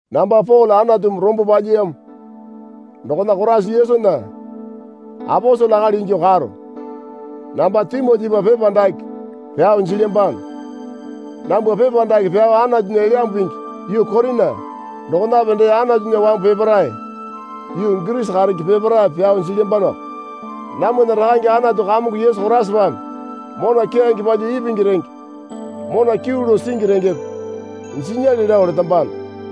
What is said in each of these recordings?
Namba Pole Anatumi rombo palyiyamo dokona Koraisa Yesunya aposele akali ingyuo karo. Namba Timotipa pepa dake pyao jilyambano. Nambwa pepa dake pyao Anatunya Elyambu Pingi yuu Korina dokonape dee Anatunya wambu peparae yuu Girisi karenge peparaepe pyao jilyambanoko. Namwana Rakane Anatu Kamongo Yesu Koraisapame mona keyange palyuo ipingi renge mona kyuu lao singi rengepe jinyale lao letambano.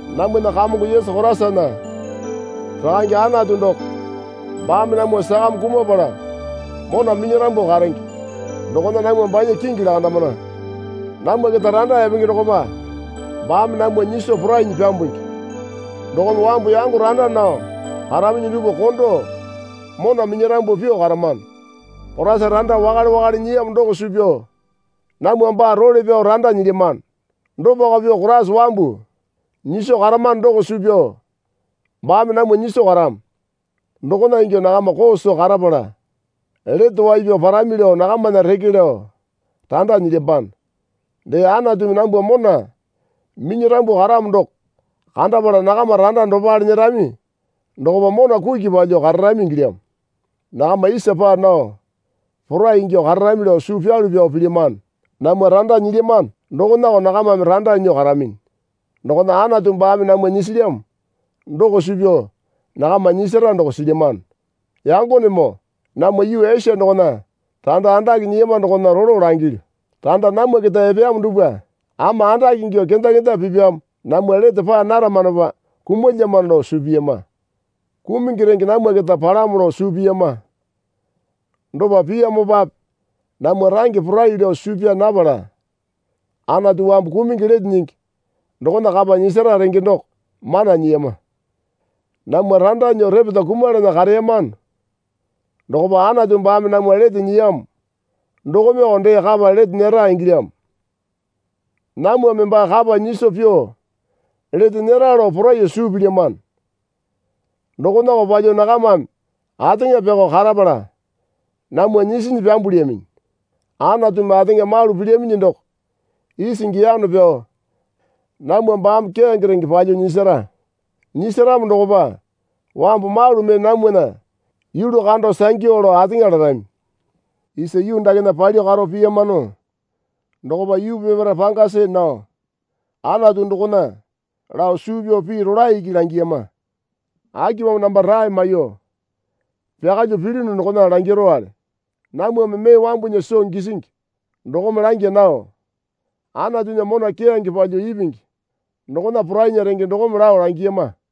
Namwana Kamongo Yesu Koraisana Rakange Anatu doko baame namwa sakame kumapala mona minyarambu karenge dokona namwa banya kingi lakandamana. Namwa keta randa epenge dokopa baame namwa nyiso porainyi pyambungi dokome wambu yango randa nao karaminyi dupwa kondo mona minyarambu pyuo karamano. Koraisa randa wakale wakale nyiyamo doko suu pyao namwa baa role pyao randa nyilyamano. Dopako pyuo Koraisa wambu nyiso karamano doko suu pyao baame namwa nyiso karamo. Dokona ingyuo nakama koo soo karapala lete wai pyao parami lao nakamana reke lao randa nelyambano. Dee Anatumi nambwa mona minyarambu karamo doko kandapala nakama randa dopale nyerami dokopa mona kuki palyuo kararami ingilyamo. Nakama isa paa nao porai ingyuo kararami lao suu pyalu pyao pilyamano. Namwa randa nyilyamano dokonako nakamame randa nyuo karaminyi. Dokona Anatu baame namwa nyisilyamo doko suu pyao nakama nyisara doko silyamano. Yangonemoo, namwa yuu Esia dokona randa andake nyiyama dokona rolo langilyu. Randa namwa keta epeyamo dupwa ama andake ingyuo kenda kenda pipyamo namwa lete paa naramanopa kumulyamano lao suu piyama. Kumungi renge namwa keta palamo lao suu piyama. Dopa piyamopape namwa range porai lao suu pyaa napala Anatu wambu kumungi lete nyingi dokona kapa nyisara renge doko mana nyiyama. Namwa randa nyuo repeta kumalana kareyamano dokopa Anatu baame namwa lete nyiyamo dokomeko dee kapa lete nyera ingilyamo. Namwame baa kapa nyiso pyuo lete nyera lao poraiyuo suu pilyamano. Dokonako palyuo nakamame ateŋa pyakao karapala namwa nyisinyi pyambulyaminyi. Anatumi ateŋa malu pilyaminyi doko isingi yano pyao namwa baame keyange renge palyuo nyisara. Nyisaramo dokopa wambu malu mee namwana yulu kando sangyu lao ateŋa larami. Isa yuu dakena palyuo karo piyamano dokopa yuu peparae panga see nao Anatu dokona lao suu pyao pii rolae iki langiyama. Akipamo namba rae maiyuo pyakalyuo pilyunu dokona langirowale. Namwame mee wambunya soo gisingi dokome langya nao Anatunya mona keyange palyuo ipingi dokona porainya renge dokome lao langiyama.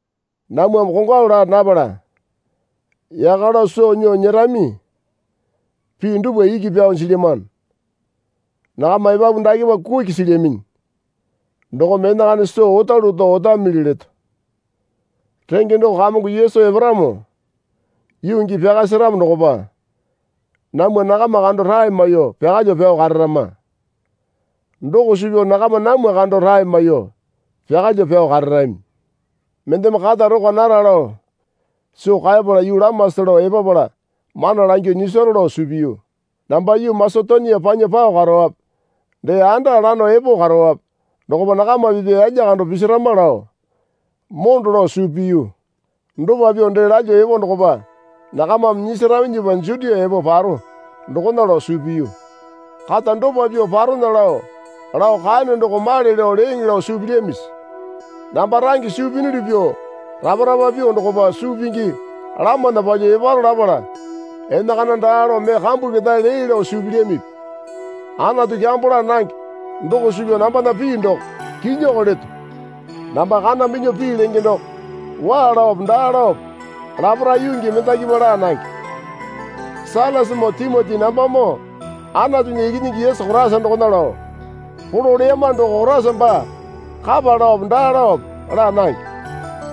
Namwame kongwalu laa napala yaka lao soo nyuo nyerami pii dupwa iki pyao jilyamano. Nakama epapu dakepa kuki silyaminyi dokome enakana soo otalu oto otamili leto. Renge doko Kamongo Yesu eparamo yuu gii pyaka seramo dokopa namwa nakama kando rae maiyuo pyakalyuo pyao kararama. Doko suu pyao nakama namwa kando rae maiyuo pyakalyuo pyao kararami. Mendeme kata rokwa nara lao soo kaepala yuu lamasa lao epapala mana langyuo nyisaro lao suu piyu. Namba yuu Masetonia panya pao karowape dee anda lano epo karowape dokopa nakama pipya yalya kando pisirama lao mondo lao suu piyu. Dopa pyuo dee lalyuo epo dokopa nakamame nyisaraminyipa Jutia epo paro dokona lao suu piyu. Kata dopa pyuo parona lao lao kaeyono doko male lao leeŋe lao suu pilyamisi? Namba range suu piyunuli pyuo rapa rapa pyuo dokopa suu pingi lamana palyuo eparo lapala enakana daa lao mee kambu ketae lee lao suu pilyamipi? Anatu kyambo laa nange doko suu pyao nambana pii doko kinyiko leto. Namba kana minyuo pii lenge doko waa laope daa laope laparae yuu gii mendakipa laa nange. Sailasamoo Timoti nambamoo Anatunya Ikinyingi Yesu Koraisa dokona lao polo leyama doko Koraisa baa kapa laope daa laope laa nange.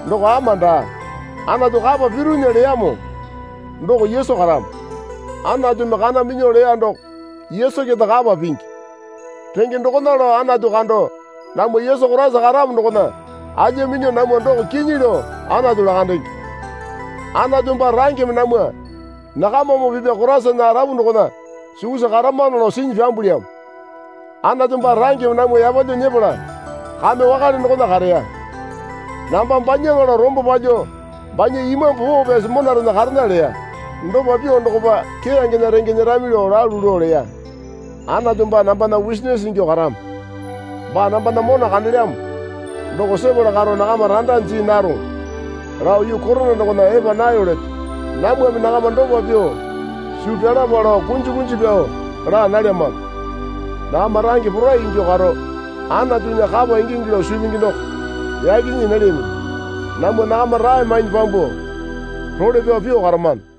Doko ama daa. Anatu kapa piruna leyamo doko Yesu karamo. Anatumi kana minyuo leya doko Yesu keta kapa pingi. Renge dokona lao Anatu kando namwa Yesu Koraisa karamo dokona alya minyuo namwa doko kinyi lao Anatu lakandenge. Anatu baa rangeme namwa nakamamoo pipya Koraisana arapu dokona sukusa karamano lao sinyi pyambulyamo. Anatu baa rangeme namwa yapalyuo nyepala kame wakale dokona kareya. Namba banyaŋa lao rombo palyuo banya Imambu Poo Pyasi monarena karena leya. Dopa pyuo dokopa keyangena renge nyerami lao lalu lao leya. Anatu baa nambana wusinisi ingyuo karamo. Baa nambana mona kandelyamo doko sepala karo nakama randa jii naroŋo lao yuu Korina dokona epa nayo leto. Namwame nakama dopa pyuo suu pyalapa lao kunji kunji pyao laa nalyamano. Nakama range porai ingyuo karo Anatunya kapa ingingi lao suu pingi doko yaki nyii nalyaminyi. Namwa nakama rae mainyi pyambuo role pyao pyuo karamano.